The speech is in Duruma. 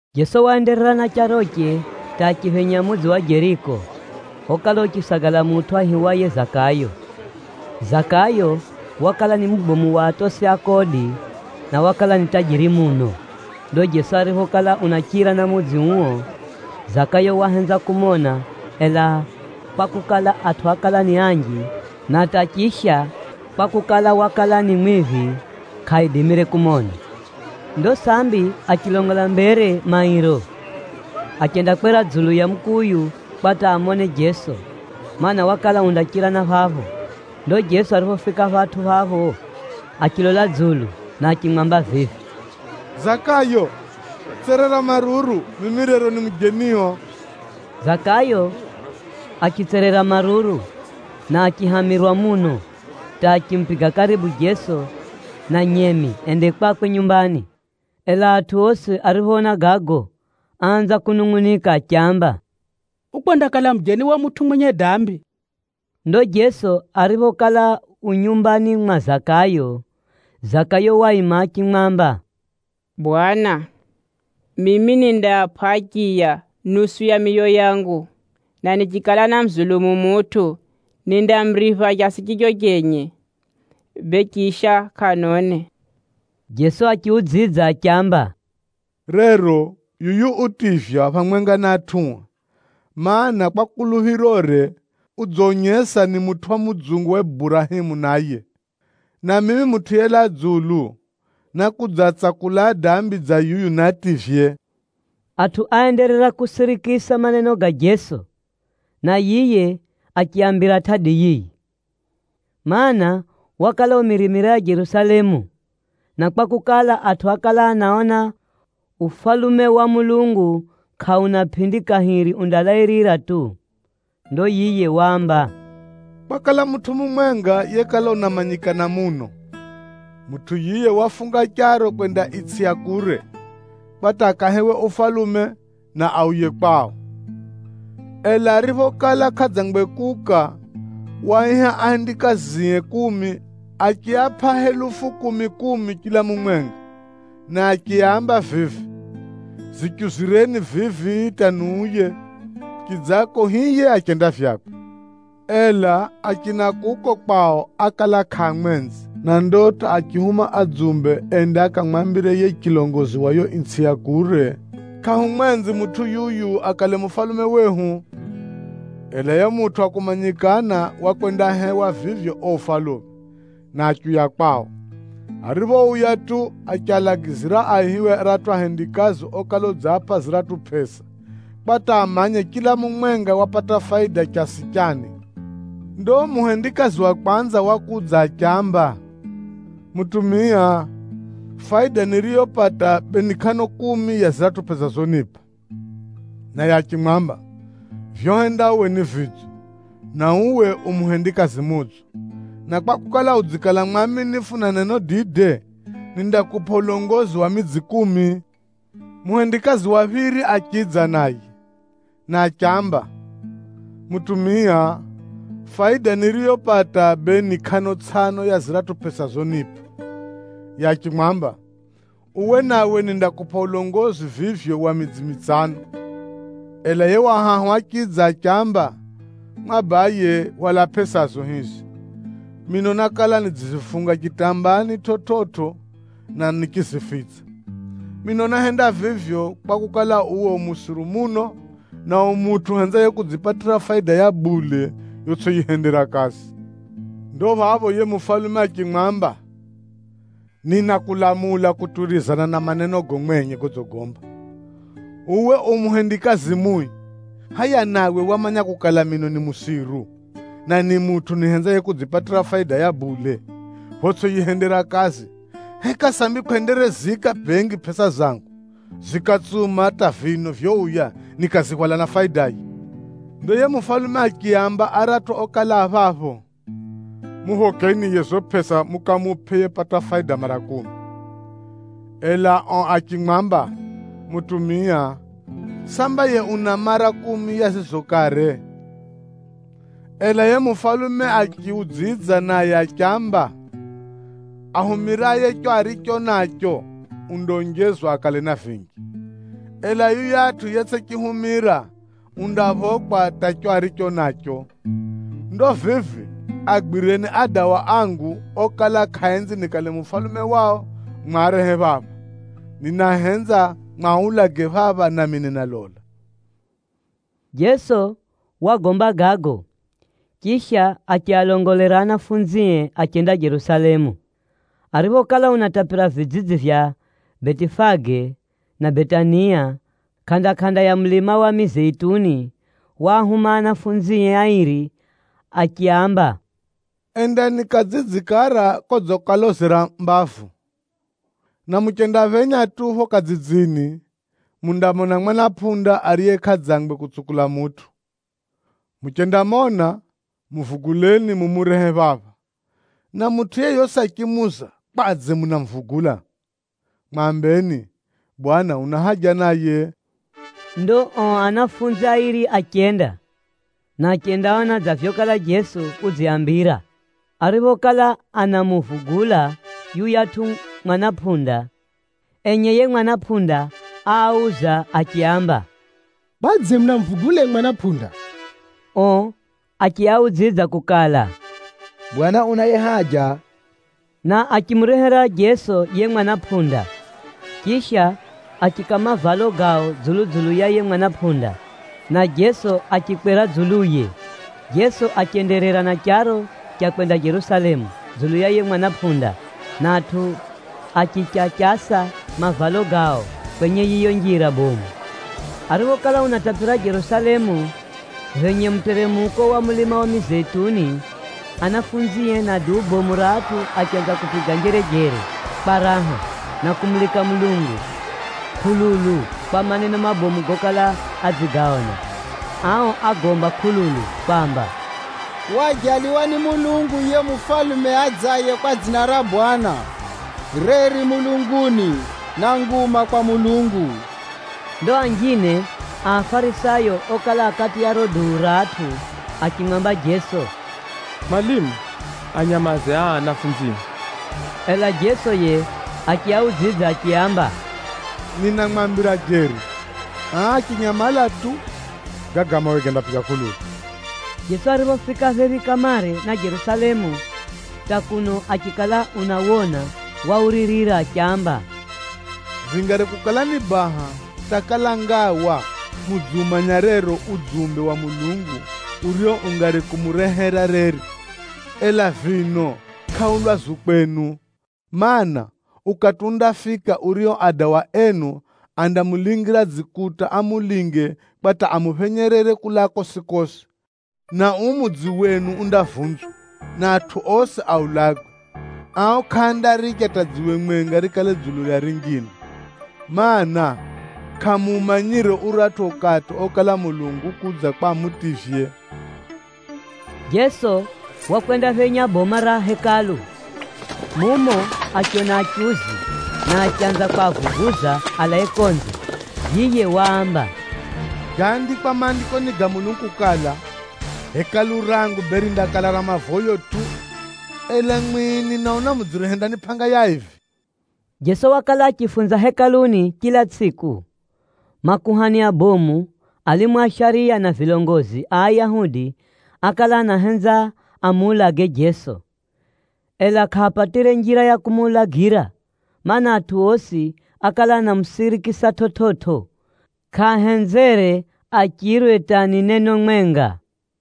Jeso waenderera na charoche hata achiphenya mudzi wa Jeriko, okala uchisagala mutʼu aihiwaye Zakayo. Zakayo wakala ni mubomu wa atosi a kodi, na wakala ni dzumbe muno. Ndo Jeso ariphokala unachira na mudzi uo, Zakayo wahenza kumona, ela kwakukala, atʼu ákala ni anji, na hata chisha kwakukala, wakala ni mwiphi, kʼaidimire kumona. Ndo sambi achilongola mbere mairo, achendakwera dzulu ya mukuyu kwa hata amone Jeso, mana, wakala undachira na phapho. Ndo Jeso ariphofika phatʼu phapho, achilola dzulu na achimwamba vivi, “Zakayo, tserera maruru, mimi rero ni mujenio.” Zakayo achitserera maruru na achihamirwa muno hata achimupiga karibu Jeso na nyemi ende kwakwe nyumbani. Ela atʼu osi ariphoona gago, áanza kunungʼunika achiamba, “Ukwendakala mujeni wa mutʼu mwenye dambi.” Ndo Jeso ariphokala u nyumbani mwa Zakayo, Zakayo waima achimwamba, “Bwana, mimi nindaapʼa achiya nusu ya miyo yangu, na nichikala námuzulumu mutʼu, nindamuripha chasi chicho chenye, bee chisha kʼano ne.” Jeso achiudzidza achiamba, “Rero yuyu utivywa phamwenga na atʼue, mana, kwa kuluphirore, udzonyesa ni mutʼu wa mudzungu wa Burahemu naye. Na mimi Mutʼu yelaa dzulu, nákudzaatsakula adambi dza yuyu niativye.” Atʼu áenderera kusirikisa maneno ga Jeso, na yiye achiaambira tʼadi yiyi, mana, wakala umirimira ya Jerusalemu, na kwakukala, atʼu ákala anaona Ufalume wa Mulungu kʼauna pʼindi kahiri undalairira tu. Ndo yiye waamba, “Kwakala mutʼu mumwenga yekala unamanyikana muno. Mutʼu yiye wafunga charo kwenda itsʼi ya kure, kwa hata akahewe ufalume na auye kwao. Ela ariphokala kʼadzangwe kuuka, waaiha ahendikazie kumi achiapʼa helufu kumi-kumi chila mumwenga, na achiaamba vivi, ‘Zichuzireni vivi hata niuye.’ Chidzako hiye achenda vyakwe. Ela achina kuko kwao ákala kʼaamwenzi, na ndo hata achihuma adzumbe ende akamwambire yiye chilongozi wa yiyo itsʼi ya kure yokala unenda kukala, ‘Kʼahumwenzi mutʼu yuyu akale mufalume wehu.’ “Ela yiye mutʼu wa kumanyikana wakwendahewa vivyo uo ufalume, na achiuya kwao. Ariphouya tu, achialagizira aihiwe aratʼu ahendikazi okala udziapʼa ziratʼu pʼesa, kwa hata amanye chila mumwenga wapata faida chasi chani. Ndo muhendikazi wa kwanza wakudza achiamba, ‘Mutumia, faida niriyopata bee ni kʼano kumi ya ziratʼu pʼesa zonipʼa.’ Naye achimwamba, ‘Vyohenda uwe ni vidzo, na uwe u muhendikazi mudzo. Na kwakukala udzikala mwaminifu na neno dide, nindakupʼa ulongozi wa midzi kumi!’ Muhendikazi wa phiri achidza naye, na achiamba, ‘Mutumia, faida niriyopata bee ni kʼano tsʼano ya ziratʼu pʼesa zonipʼa.’ Yiye achimwamba, ‘Uwe nawe nindakupʼa ulongozi vivyo wa midzi mitsano.’ “Ela yiye wa hahu achidza achiamba, ‘Mwabaye, hwala pʼesazo hizi. Mino nákala nidzizifunga chitambaani chividzo, na nichizifitsa. Mino náhenda vivyo, kwakukala, uwe u musiru muno, na u mutʼu uhenzaye kudzipatira faida ya bule yotsʼiyihendera kazi.’ Ndo phapho yiye mufalume achimwamba, ‘Ninakulamula kutuwirizana na manenogo mwenye godzigomba, uwe u muhendikazi mui! Hʼaya nawe wamanya kukala mino ni musiru, na ni mutʼu nihenzaye kudzipatira faida ya bule photsʼiyihendera kazi, heka sambi kʼwendereziika bengi pʼesa zangu zikatsuma hata vino vyouya nikazihwala na faidaye?’ “Ndo yiye mufalume achiaamba aratʼu okala a phapho, ‘Muphokeni yiye zizo pʼesa mukamupʼe yepata faida mara kumi.’ Ela ao achimwamba, ‘Mutumia, samba yiye una mara kumi ya zizo kare!’ Ela yiye mufalume achiudzidza naye achiamba, ‘Ahumiraye chicho aricho nacho, undaonjezwa akale na vinji, ela yuyatʼu yetsʼichihumira, undaphokwa hata chicho aricho nacho. Ndo vivi agwireni adawa angu okala kʼaaenzi nikale mufalume wao mwarehe phapha, ninahenza mwaulage phapha nami ninalola.’” Jeso wagomba gago, chisha achialongolera anafunzie achenda Jerusalemu. Ariphokala unatapira vidzidzi vya Betifage na Betania kʼanda-kʼanda ya mulima wa Mizeituni, waahuma ahumwae airi achiaamba, “Endani kadzidzi kara kodzikalozera mbavu, na muchendaphenya tu phapho kadzidzini, mundamona mwana pʼunda, ariye kʼadzangwe kutsukula mutʼu. Muchendamona, muvuguleni mumurehe phapha. Na mutʼu yeyosi achimuuza, ‘Kwadze munamuvugula?’ Mwambeni, ‘Bwana una haja naye.’” Ndo ao ahumwa airi achenda, na achendaona dza vyokala Jeso udziaambira. Ariphokala anamuvugula yuyatʼu mwana pʼunda, enye yiye mwana pʼunda áauza achiaamba, “Kwadze munamuvugula yiye mwana pʼunda?” Ao achiaudzidza kukala, “Bwana unaye haja.” Na achimurehera Jeso yiye mwana pʼunda. Chisha, achiika mavalo gao dzulu-dzulu ya yiye mwana pʼunda, na Jeso achikwera dzuluye. Jeso achenderera na charo cha kwenda Jerusalemu dzulu ya yiye mwana pʼunda, na atʼu achichachasa mavalo gao kwenye yiyo njira bomu. Ariphokala unatapira Jerusalemu, phenye muteremuko wa mulima wa Mizeituni, anafunzie na duu bomu ra atʼu achanza kupiga njerejere kwa raha, na kumulika Mulungu kʼululu kwa maneno mabomu gokala adzigaona. Ao ágomba kʼululu kwamba, “Waajaliwa ni Mwenyezi Mulungu yiye mufalume adzaye kwa dzina ra Bwana. Reri mulunguni, na nguma kwa Mulungu!” Ndo anjine a Afarisayo okala a kati ya riro duu ra atʼu achimwamba Jeso, “Mwalimu, anyamaze aa anafunzio!” Ela Jeso yiye achiaudzidza achiaamba, “Ninamwambira jeri, aa achinyamala tu, gaga mawe gandapiga kʼululu.” Jeso ariphofika phephi kamare na Jerusalemu hata kuno achikala unawona, wauririra achiamba, “Vingari kukala ni baha hata kala ngawa mudziumanya rero udzumbe wa Mulungu urio ungari kumurehera reri! Ela vino kʼau lwazu kwenu. Maana, ukati undafika urio adawa enu andamulingira dzikuta amulinge kwa hata amuphenyerere kulaa kosi-kosi, na uu mudzi wenu undavunzwa, na atʼu osi aulagwe. Ao kʼaandaricha hata dziwe mwenga rikale dzulu ya rinjine, mana, kʼamuumanyire uratʼu ukati okala Mulungu ukudza kwa amutivye.” Jeso wakwendaphenya boma ra Hekalu. Mumo achiona achuzi, na achanza kwavuguza alae konze. Yiye waamba, “Gaandikwa Maandikoni ga Mulungu kukala, ‘Nyumba yangu yindakala nyumba ya mavoyo.’ Ela mwimwi, ninaona mudziyihenda ni pʼanga ya aivi!” Jeso wakala achifunza Hekaluni chila tsʼiku. Makuhani abomu, alimu a shariya na vilongozi a Ayahudi ákala anahenza amuulage Jeso, ela kʼaapatire njira ya kumuulagira, mana, atʼu osi ákala anamusirikisa chividzo, kʼaahenzere achirwe hata ni neno mwenga.